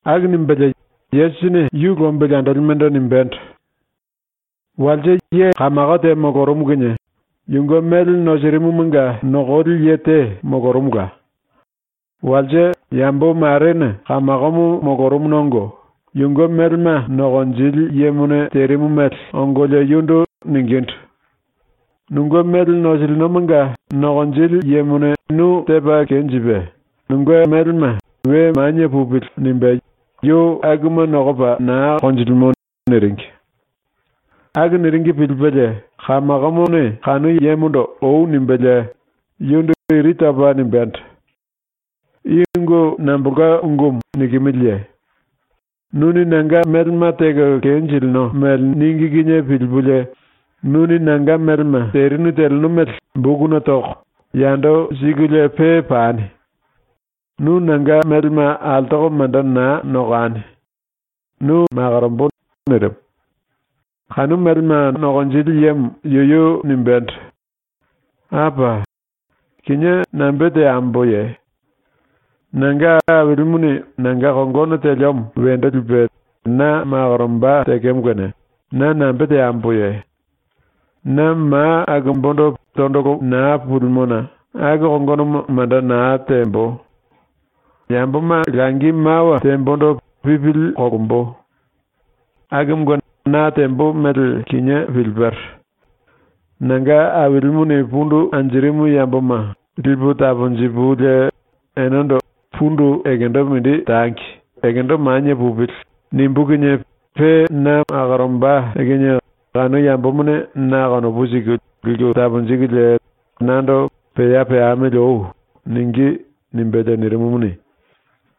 ⸤Aku nimbelie⸥ Yesusini yu lombili andolimendo nimbendo: “Walse ye kamako te molorumu kinie yunge mele nosirimumanga nokoli ye te molorumula. Walse yambo marene kamakomo molorumuna ongo, yunge melema nokonjili yemone terimu mele ongolie yundu ningindu: “Nunge mele nosilinomanga nokonjili yemone nu tepa kenjipe, nunge melema ‘We manie pupili.’ nimbe yu akuma nokopa naa konjilimo.” niringi. Aku niringi pilipelie kamakomone kanu yemondo ‘Oi.’ nimbelie yundu iri topa nimbendo: “I ungu nambolka ungumu nikimiliye? Nuni nanga melema teko kenjilino mele níngi kinie pilipulie nuni nanga melema terinu teleno mele bokuna toko, yando sikulie pe pani. Nu nanga melema altoko manda naa nokani. Nu makorombo.” nirimu. Kanu melema nokonjili yemo yuyu nimbendo: “Apa! Kinié nambe teamboye? Nanga ailimuni nanga kongono teliomo wendo lipe na makoromba tekemo kene na nambe teamboye? Na ma akumbundu tondolo naa pulimona aku kongonomo manda naa tembo. Yamboma langi mawa tembondo pipili kolombo. Akumunge na tembo mele kinié pilipero. ⸤Nanga ailimuni pundu anjirimu yamboma lipu taponjipulie enendo ‘Pundu ekendo mindi tangi, ekendo manie pupili.’ nimbú kinie⸥ pe na makoromba kinie kanu yambomane na konopu siku liku taponjikulie nando “Pea peamili oi.” ningí.” nimbelie nirimumuni,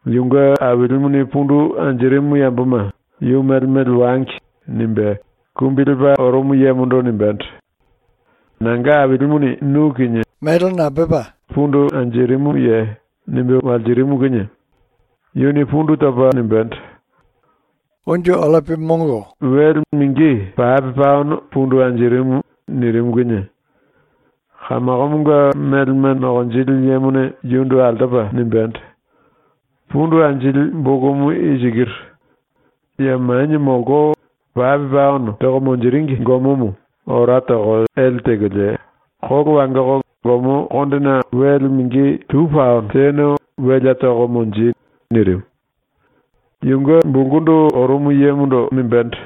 yunge ailimuni pundu anjirimu yamboma ‘Yu mele mele wangi.’ nimbe kumbi lepa orumu yemondo nimbendo: “Nanga ailimuni nu kinie nambolka mele pundu anjirimuye?” nimbe walsirimu kinie yuni pundu topa nimbendo: “Wele mingi pape paono pundu anjirimu.” nirimu kinie kamakomonga melema nokonjili yemone yundu altopa nimbendo: “Pundu anjili bokumu i sikiru; ya manie molko, pape paono toko monjiringi gomomo ora toko ele tekolie kolo wangoko gomo kondena wele mingi tu paono tene welea toko monji.” nirimu. Yunge bulkundu orumu yemondo nimbendo: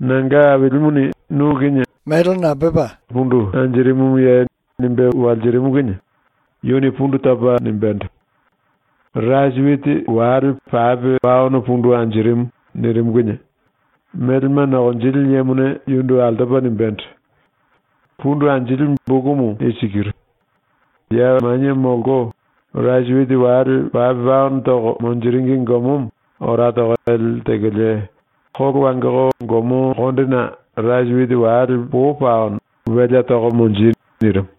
“Nanga ailimuni nu kinie nambolka mele pundu anjirimuye?” nimbe walsirimu kinie yuni pundu topa nimbendo: “Rasi witi wale pape paono pundu anjirimu.” nirimu kinie melema nokonjili yemone yundu altopa nimbendo: “Pundu anjili bokumu i sikiru; ya manie molko, rasi witi wale pape paono toko monjiringi gomomo ora toko ele tekolie kolo wangoko gomo kondena rasi witi wale po paono welea toko monji.” nirimu.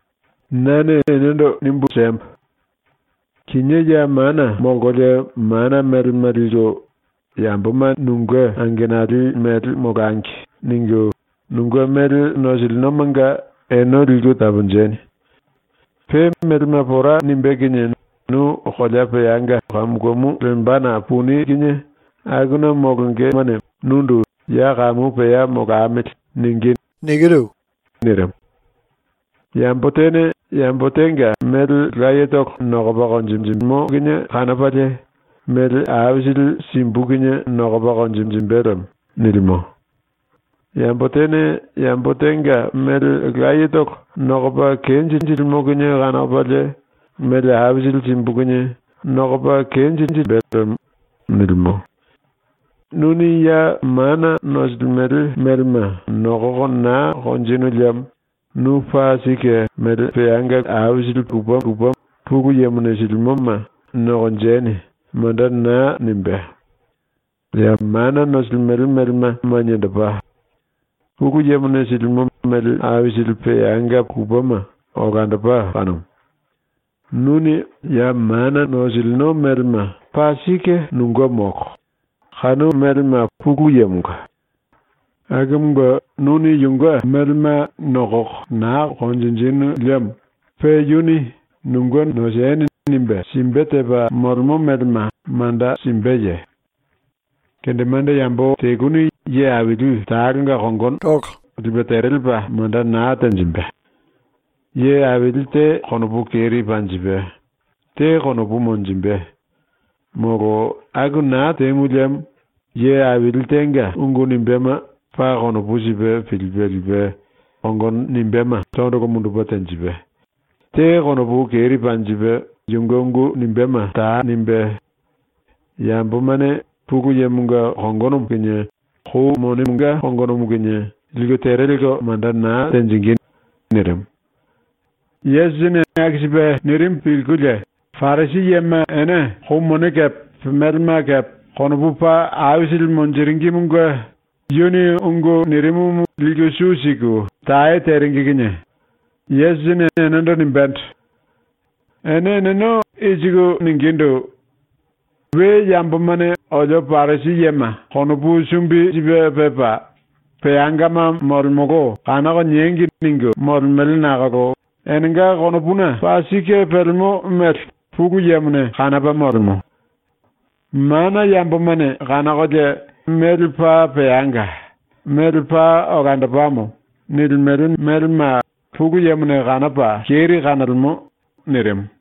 “Nane enendo nimbu siembo: Kinié ya mana molkolie mana melema liku ‘Yamboma nunge angenali mele molangi.’ ningu nunge mele nosilinomanga ene liku taponjeni. Pe melema pora nimbé kinie nu kolea peanga kamu kamu lembana puni kinie akuna molongemane nundu “Ya kamu pea molamili.” ningí.” ⸤nirimu.⸥ “Yambo tene yambo tenga mele layetolo nokopa konjinjilimo kinie kanopalie ‘Mele aisili simbu kinie nokopa konjinjimbe lemo.’ nilimo. Yambo tene yambo tenga mele layetolo nokopa kenjinjilimo kinie kanopalie “Mele aisili simbu kinie nokopa kenjinjimbe lemo.” nilimo. Nuni ya mana nosilimele melema nokoko naa konjinu liemo nu paa sike mele aisili peanga lupema, Pulu Yemone silimo mele aisili peangama, ‘Nokonjeni.’ manda naa nimbé. ⸤Ya mana nosilimele melema maniendopa, Pulu Yemone silimo mele aisili peanga lupema olandopa kanumu.⸥ Nuni ya mana nosilino melema paa sike nunge molo, kanu melema Pulu Yemonga. Akumunge nuni yunge melema nokoko naa konjinjinu liemo pe yuni ‘nunge noseni.’ nimbe simbe tepa molemo melema manda simbeye? “Kendemande yambo teluni ye aili talonga kongono lipe tere lepa manda naa tenjimbe. Ye aili te konopu keri panjipe, te konopu monjimbe. Molo aku naa temu liemo ye aili tenga ungu nimbéma paa konopu sipe pilipe lipe kongono nimbéma tondolo mundupe tenjipe, te konopu keri panjipe yunge ungu nimbéma ta nimbé. Yambomane Pulu Yemonga kongonomo kinie Kou Monemonga kongonomo kinie liku tere lelko manda naa tenjingí.” nirimu. Yesusini aku sipe nirimu pilkulie Parisi yema ene kou mone kepe melema kepe konopu paa aisili monjiringimunge yuni ungu nirimumu liku su siku tae teringi kinie Yesusini enendo nimbendo: “Ene eneno i siku ningindu: ‘We yambomane olio Parisi yema konopu sumbi sipe pepa, peangama molemolo kanoko niengi.’ ningu molemele nakolo enenga konopuna paa sike pelemo mele Pulu Yemone kanopa molemo. Mana yambomane kanokolie ‘Mele paa peanga, mele paa olandopamo.’ nilimele melema Pulu Yemone kanopa keri kanolemo.” ⸤nirimu.⸥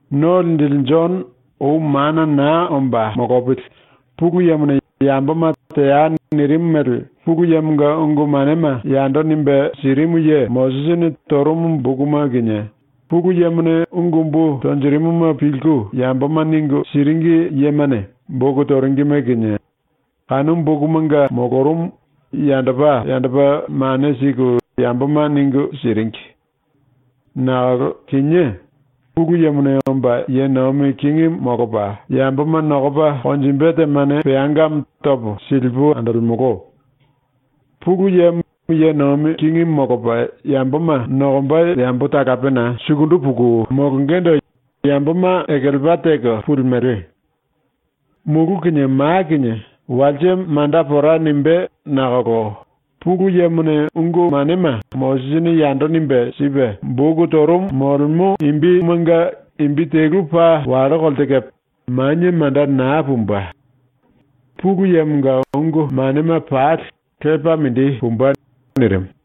“⸤No Linjili⸥ Jono ou mana naa omba molopili Pulu Yemone yamboma ‘Teai.’ nirimu mele ⸤Pulu Yemonga ungu manema yando nimbe sirimu ye⸥ Mosisini torumu bokuma kinie, Pulu Yemone ungu umbu tonjirimuma pilku yamboma ningu siringi yemane boku toringime kinie, kanu bokumanga molorumu, yandopa yandopa mane siku yamboma ningu siringi. Nakolo kinié, Pulu Yemone omba ye nomi kingimu molopa yamboma nokopa konjimbe temane peangamo topo silipu andolemolo. Pulu Yemo ye nomi kingimu molopa yamboma nokomba yambo talapena sukundu puku molongendo yamboma ekelepa teko pulimele. Mulu kinie ma kinie walse manda pora nimbé nakolo Pulu Yemone ungu manema Mosisini yando nimbe sipe boku torumu bokumanga molemo ungumanga imbi torumumanga imbi telu paa wallo kolte kepe manie manda naa pumbe. Pulu Yemonga ungu manema pali lepa mindi pumbe.” ⸤nirimu.⸥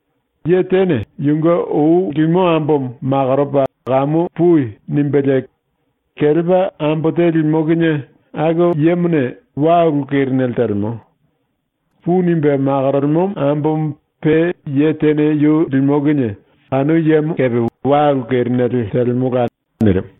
“Ye tene yunge ou limo ambomo makoropa “Kamu pui.” nimbelie kelepa ambo te limo kinie aku yemone wa ulu kerinele telemo. “Pui.” nimbe makorolemo ambomo pe ye tene yu limo kinie kanu yemo kepe wa ulu kerinele telemola.” ⸤nirimu.⸥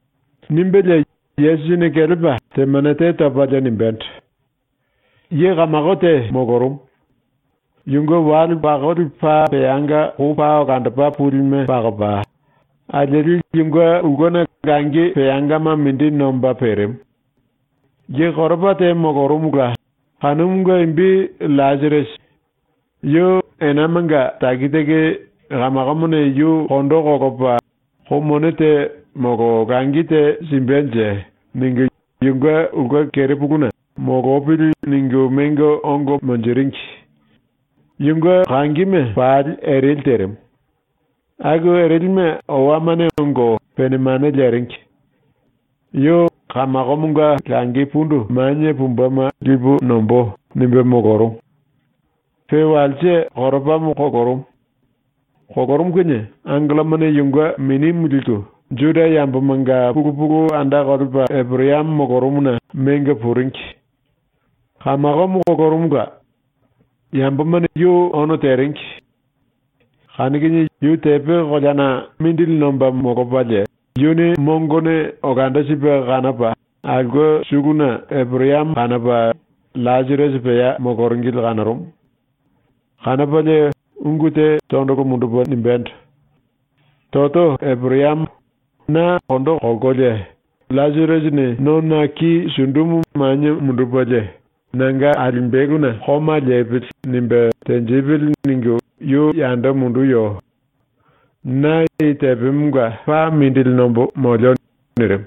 ⸤Nimbelie Yesusini kelepa temane te topalie nimbendo:⸥ “Ye kamako te molorumu. Yunge wale pakoli paa peanga kou paa olandopa pulime pakopa, alieli yunge ulkena langi peangama mindi nomba perimu. Ye koropa te molorumula, kanumunge imbi LLasirasi. Yu enamanga taki taki ‘Kamakomone yu kondo kolopa kou mone te molo langi te simbenje.’ ningu yunge ulke kerepuluna ‘Molopili.’ ningu mengo ongo monjiringi. Yunge kangime pali ereli terimu. Aku erelime owamane ongo pene mane leringi. Yu ‘Kamakomonga langi pundu manie pumbema lipu nombó.’ nimbe molorumu. Pe walse koropamo kolorumu. Kolorumu kinie angellomane yunge minimu liku, ⸤Juda yambomanga pulu pulu anda kolepa⸥ Eporayamo molorumuna mengo puringi. Kamakomo kolorumula. Yambomane yu ono teringi. Kanu kinie yu tepe koleana mindili nomba molopalie, yuni mongone olando sipe kanopa aulke suluna Eporayamo kanopa LLasirasi pea moloringili kanorumu. Kanopalie ungu te tondolo mundupe nimbendo: “Toto Eporayamo, na kondo kolkolie ‘LLasirasini nona ki sundumu manie mundupelie ‘Nanga alimbeluna koma lepili.’ nimbe tenjipili.’ ningu yu yando munduyo. Na i tepemonga paa mindili nombo molio.” nirimu.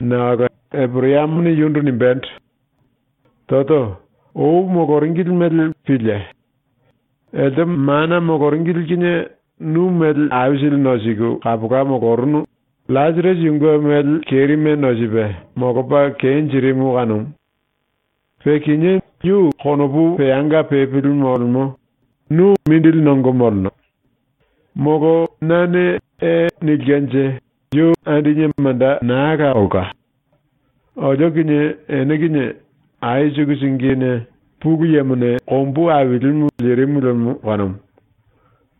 Nakolo Eporayamone yundu nimbendo: “Toto, ou moloringili mele pílie! Elte mana moloringili kinie nu mele aisili nosiku kapola molorunu; LLasirasi yunge mele kerime nosipe, molopa kenjirimu kanumu. Pe kinié yu konopu peanga pepili molemo, nu mindili nongo moleno. Molo nane “E.” nilkenje yu andine manda naa la olka. Olio kinie ene kinie ai suku singine ⸤Pulu Yemone⸥ kombu ailimu lirimu lemo kanumu.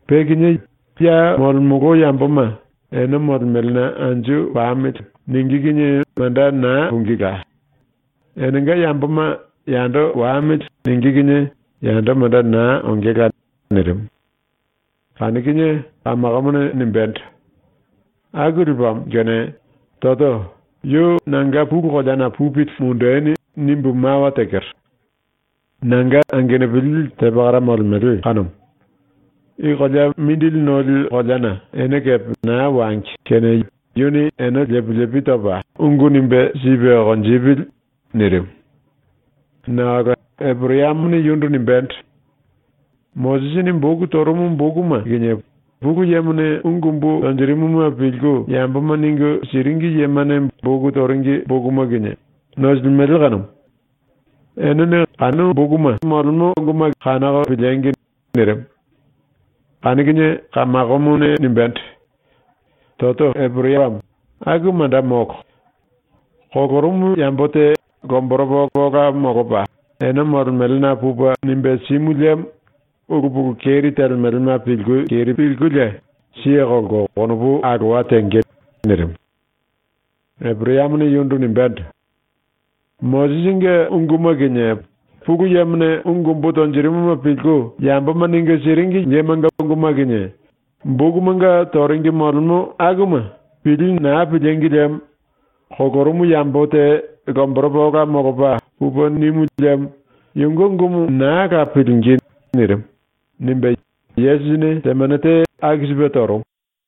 Pe kinié ya molemolo yamboma ‘Ene molemelena anju pamili.’ ningí kinie manda naa pungíla; enenga yamboma ‘Yando wamili.’ ningí kinie yando manda naa ongela.” nirimu. Kanu kinie kamakomone nimbendo: “Aku lepamo kene, Toto, yu nanga pulu koleana pupili mundeni nimbu mawa tekero. Nanga angenupili te pakara molemele kanumu. I kolea mindili noli koleana ene kepe naa wangi kene yuni ene lepi lepi topa ungu nimbe sipe konjipili.” nirimu. Nakolo Eporayamone yundu nimbendo: “Mosisini boku torumu bokuma kinie Pulu Yemone ungu umbu tonjirimuma pilku yamboma ningu siringi yemane boku toringi bokuma kinie nosilimele kanumu. Enene kanu bokuma kanoko piliengi!” nirimu. Kanu kinie kamakomone nimbendo: “Toto Eporayamo, aku manda molo. Kolorumu yambo te lomboropa ola molopa ene molemelena pupe nimbe simu liemo ulu pulu keri telemelema pilku keri pilkulie siye kolko konopu alowa tenge.” nirimu. Eporayamone yundu nimbendo: “Mosisinge unguma kinie Pulu Yemone ungu umbu tonjirimuma pilku yamboma ningu siringi yemanga unguma kinie ⸤bokumanga toringi molemo akuma⸥ pilí naa pilíngi liemo kolorumu yambo te lomboropa ola molopa pupe nimu liemo yunge ungumu naa la pilingí.” nirimu.” nimbe Yesusini temane te aku sipe torumu.